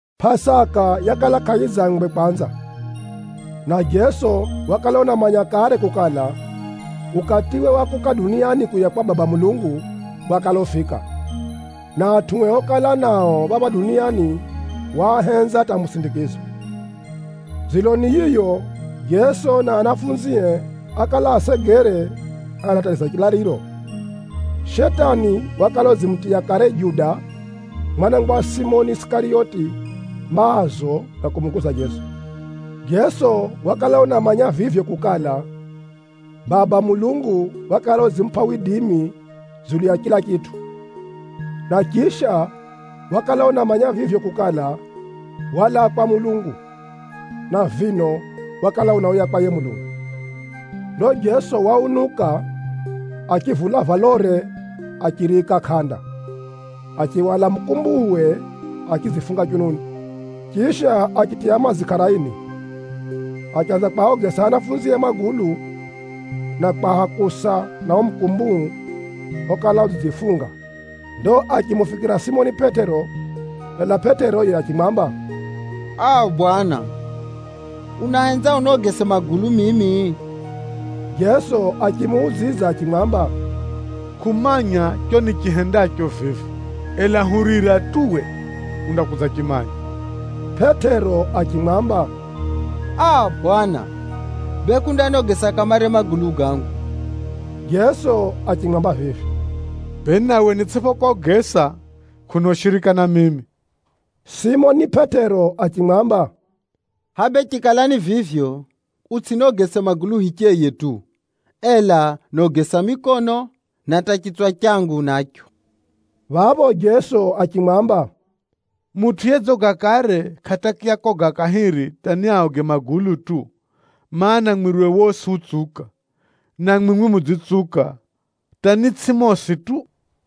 Pʼasaka yakala kʼayidzangwe kwanza, na Jeso wakala unamanya kare kukala, ukatiwe wa kuuka duniani kuuya kwa Baba Mulungu, wakala ufika, na atʼue okala nao phapha duniani waahenza hata musindikizo. Dziloni yiyo, Jeso na ahumwae ákala asegere anatariza chilaliro. Shetani wakala udzimutiya kare Juda, mwana wa Simoni Isikariyoti, maazo ga kumuguza Jeso. Jeso wakala unamanya vivyo kukala, Baba Mulungu wakala udzimupʼa widimi dzulu ya chila chitʼu. Na chisha, wakala unamanya vivyo kukala, walaa kwa Mulungu, na vino wakala unauya kwa yiye Mulungu. Ndo Jeso waunuka, achivula valore achiriika kʼanda, achihwala mukumbuuwe achidzifunga chununi. Chisha, achitiya madzi kʼaraini, achanza kwaogesa anafunzie magulu, na kwahakusa na uo mukumbuu okala udzidzifunga. Ndo achimufikira Simoni Pʼetero, ela Pʼetero yiye achimwamba, “Aa! Bwana, unahenza unogese magulu mimi?” Jeso achimuudzidza achimwamba, “Kʼumanya chicho nichihendacho vivi, ela hurira tu uwe undakudzachimanya.” Pʼetero achimwamba, “Aa! Bwana, bee kʼundanogesa kamare magulu gangu.” Jeso achimwamba vivi, “Bee nawe nitsʼiphokogesa, kʼuna ushirika na mimi.” Simoni Pʼetero achimwamba, “Bwana hʼaya bee chikala ni vivyo, utsʼiniogese magulu hicheye tu, ela niogesa mikono, na hata chitswa changu nacho!” Phapho Jeso achimwamba, “Mutʼu yedzoga kare, kʼatakiya koga kahiri hata niaoge magulu tu, mana, mwiriwe wosi utsuka. Na mwimwi mudzitsuka, hata ni tsʼimwi mosi tu.”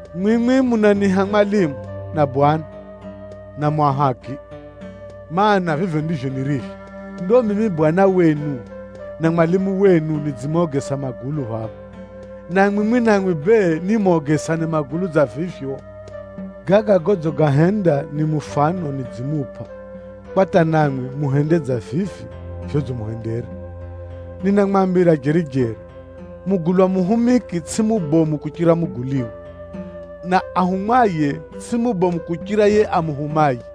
Mwimwi munaniiha Mwalimu na Bwana, na mu ahaki, mana, vivyo ndivyo nirivyo. Ndo mimi Bwana wenu na Mwalimu wenu, nidzimogesa magulu phapha, na mwimwi namwi bee nimogesane magulu dza vivyo. Gaga godzigahenda ni mufano nidzimupʼa kwa hata namwi muhende dza vivi vyodzimuhendera. Ninamwambira jeri-jeri, mugulwa muhumiki tsʼiye mubomu kuchira tajiriwe, na ahumwaye tsʼiye mubomu kuchira yiye amuhumaye.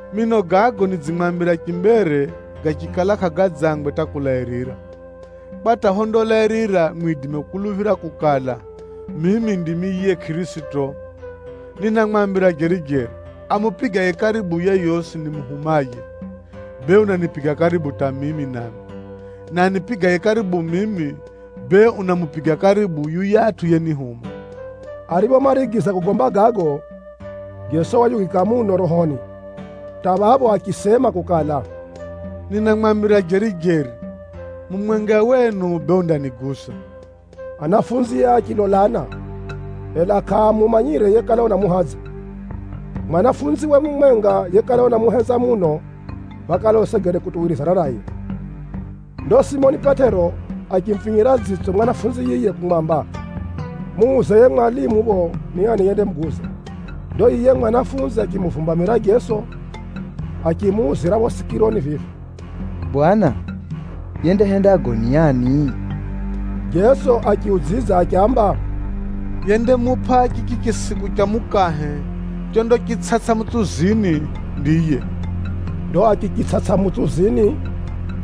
Mino gago nidzimwambira chimbere gachikala kʼagadzangwe hata kulairira, kwa hata phondalairira mwidime kukuluphira kukala, mimi ndimi yiye Kʼirisito. Ninamwambira jeri-jeri, amupigaye karibu yeyosi nimuhumaye, bee unanipiga karibu hata mimi nami, na anipigaye karibu mimi, bee unamupiga karibu hata yuyatʼu yenihuma.” Ariphomarigiza kugomba gago, Jeso wayugika muno rohoni, hata phapho achisema kukala, “Ninamwambira jeri-jeri, mumwenga wenu bee undaniguza.” Ahumwae achilolana, ela kʼaamumanyire yekala unamuhadza. Muhumwawe mumwenga yekala unamuhenza muno wakala usegere kutuwirizana naye. Ndo Simoni Pʼetero achimufinyira dzitso muhumwa yiye kumwamba, “Muuze yiye mwalimu phapho ni ani yendamuguza.” Ndo yiye muhumwa achimuvumbamira Jeso, achimuuzira phapho sikironi vivi, “Bwana, yendahenda gago ni ani?” Jeso achiudzidza achiamba, “Yendamupʼa chichi chisiku cha mukahe chondachitsʼatsʼa mutsuzini, ndiye.” Ndo achichitsʼatsʼa mutsuzini,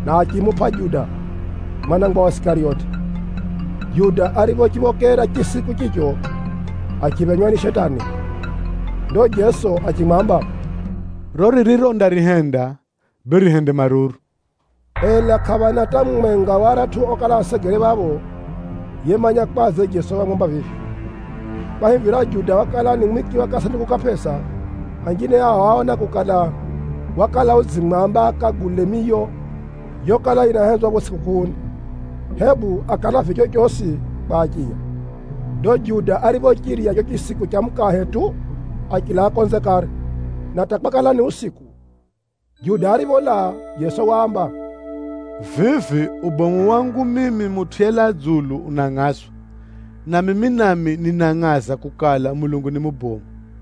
na achimupʼa Juda, mwana wa Simoni Isikariyoti. Juda ariphochiphokera chisiku chicho, achiphenywa ni Shetani. Ndo Jeso achimwamba, “Riro ririro undarihenda, bee rihende maruru!” Ela kʼaphana hata mumwenga wa aratʼu okala asegere phapho yemanya kwadze Jeso wamwamba vivyo. Kwahivira Juda wakala ni mwiki wa kasanduku ka pʼesa, anjine ao áona kukala, wakala udzimwamba akagule miyo yokala yinahenzwa phapho tsʼikukʼuuni, hebu akalavye chochosi kwa achiya. Ndo Juda ariphochirya chicho chisiku cha mukahe tu, achilaa konze kare, na hata kwakala ni usiku. Juda aripholaa, Jeso waamba, “Vivi ubomu wangu mimi Mutʼu yelaa dzulu unangʼazwa, na mimi nami ninangʼaza kukala, Mulungu ni mubomu.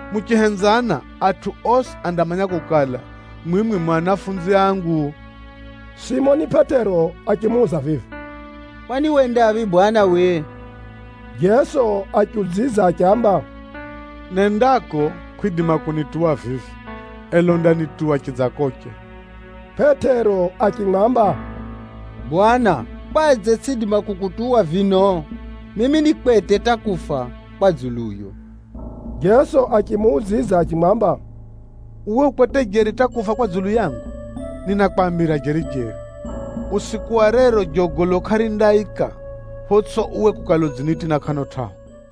Muchihenzana, atʼu osi andamanya kukala, mwimwi mu anafunzi angu.” Simoni Pʼetero achimuuza vivi, “Kwani wendaphi Bwana uwe?” Jeso achiudzidza achiamba, “Nendako kʼwidima kunituwa vivi, ela undanituwa chidzakoche.” Pʼetero achimwamba, “Bwana, kwadze tsʼiidima kukutuwa vino? Mimi ni kwete hata kufa kwa dzuluyo!” Jeso achimuudzidza achimwamba, “Uwe u kwete jeri hata kufa kwa dzulu yangu? Ninakwambira jeri-jeri, usiku wa rero jogolo kʼarindaika, photsʼipho uwe kukala udzinitina kʼano tʼahu!”